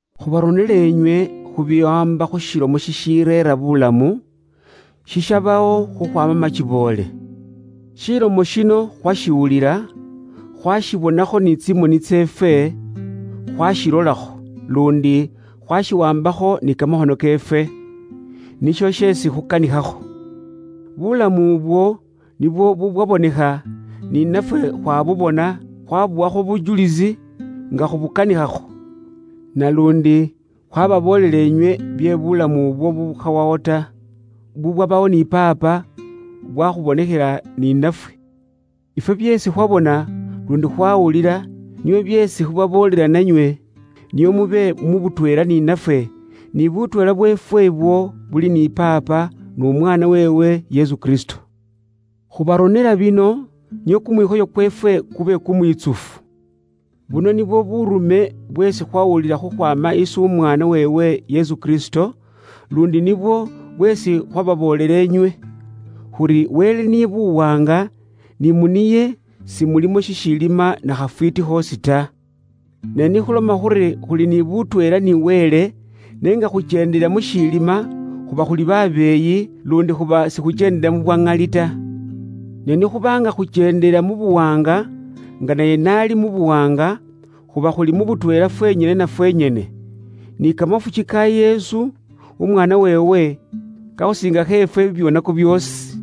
Khubaronela inywe khu biwaamba khu Shilomo shishireera buulamu, shishabawo khukhwaama makiboole. Shilomo shino khwashiwulila, khwashibonakho ni tsimoni tseefwe khwashilolakho, luundi khwashiwaambakho ni kamakhono keefwe. Nisho sheesi khukanikhakho. Bulamu ubwo nibwo bubwabonekha, ni nafwe khwabubona, khwabuwakho bujulisi nga khubukanikhakho, naluundi khwababoolela inywe bye buulamu ubwo bubukhawawo ta, bubwabawo ni Paapa, bwakhubonekhela ni nafwe. Ifwe byeesi khwabona, luundi khwawulila, nibyo byeesi khubaboolela nanywe, nio mube mu butweela ni nafwe, ni butweela bweefwe ibwo buli ni Paapa, n'Umwaana weewe, Yesu Kristo. Khubaronela bino nio kumwikhoyo kweefwe kube kumwitsufu. Buno nibwo buurume bweesi khwawulila khukhwaama isi Umwaana weewe Yesu Kristo, luundi nibwo bweesi khwababoolela inywe; khuri, Wele niye Buwaanga, ni mu niye simulimo shishiilima na khafwiiti khoosi ta. Ne nikhuloma khuri khuli ni butweela ni Wele, n'enga khukyendela mushiilima, khuba khuli babeeyi, luundi khuba sikhukyendela mu bwa ŋali ta. Ne ni khuba nga khukyendela mu buwaanga, nga naye n'ali mu buwaanga, khuba khuli mu butweela fwenyene na fwenyene. Ni kamafuki ka Yesu, Umwaana weewe, kakhusiingakho ifwe bibyoonako byoosi.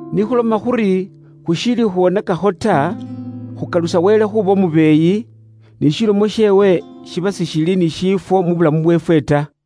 Ni khuloma khuri, khushiili khwonakakho ta, khuba khukalusa Wele khuuba umubeeyi, ni shilomo sheewe shiba sishili ni shiifwo mu bulamu bweefwe ta.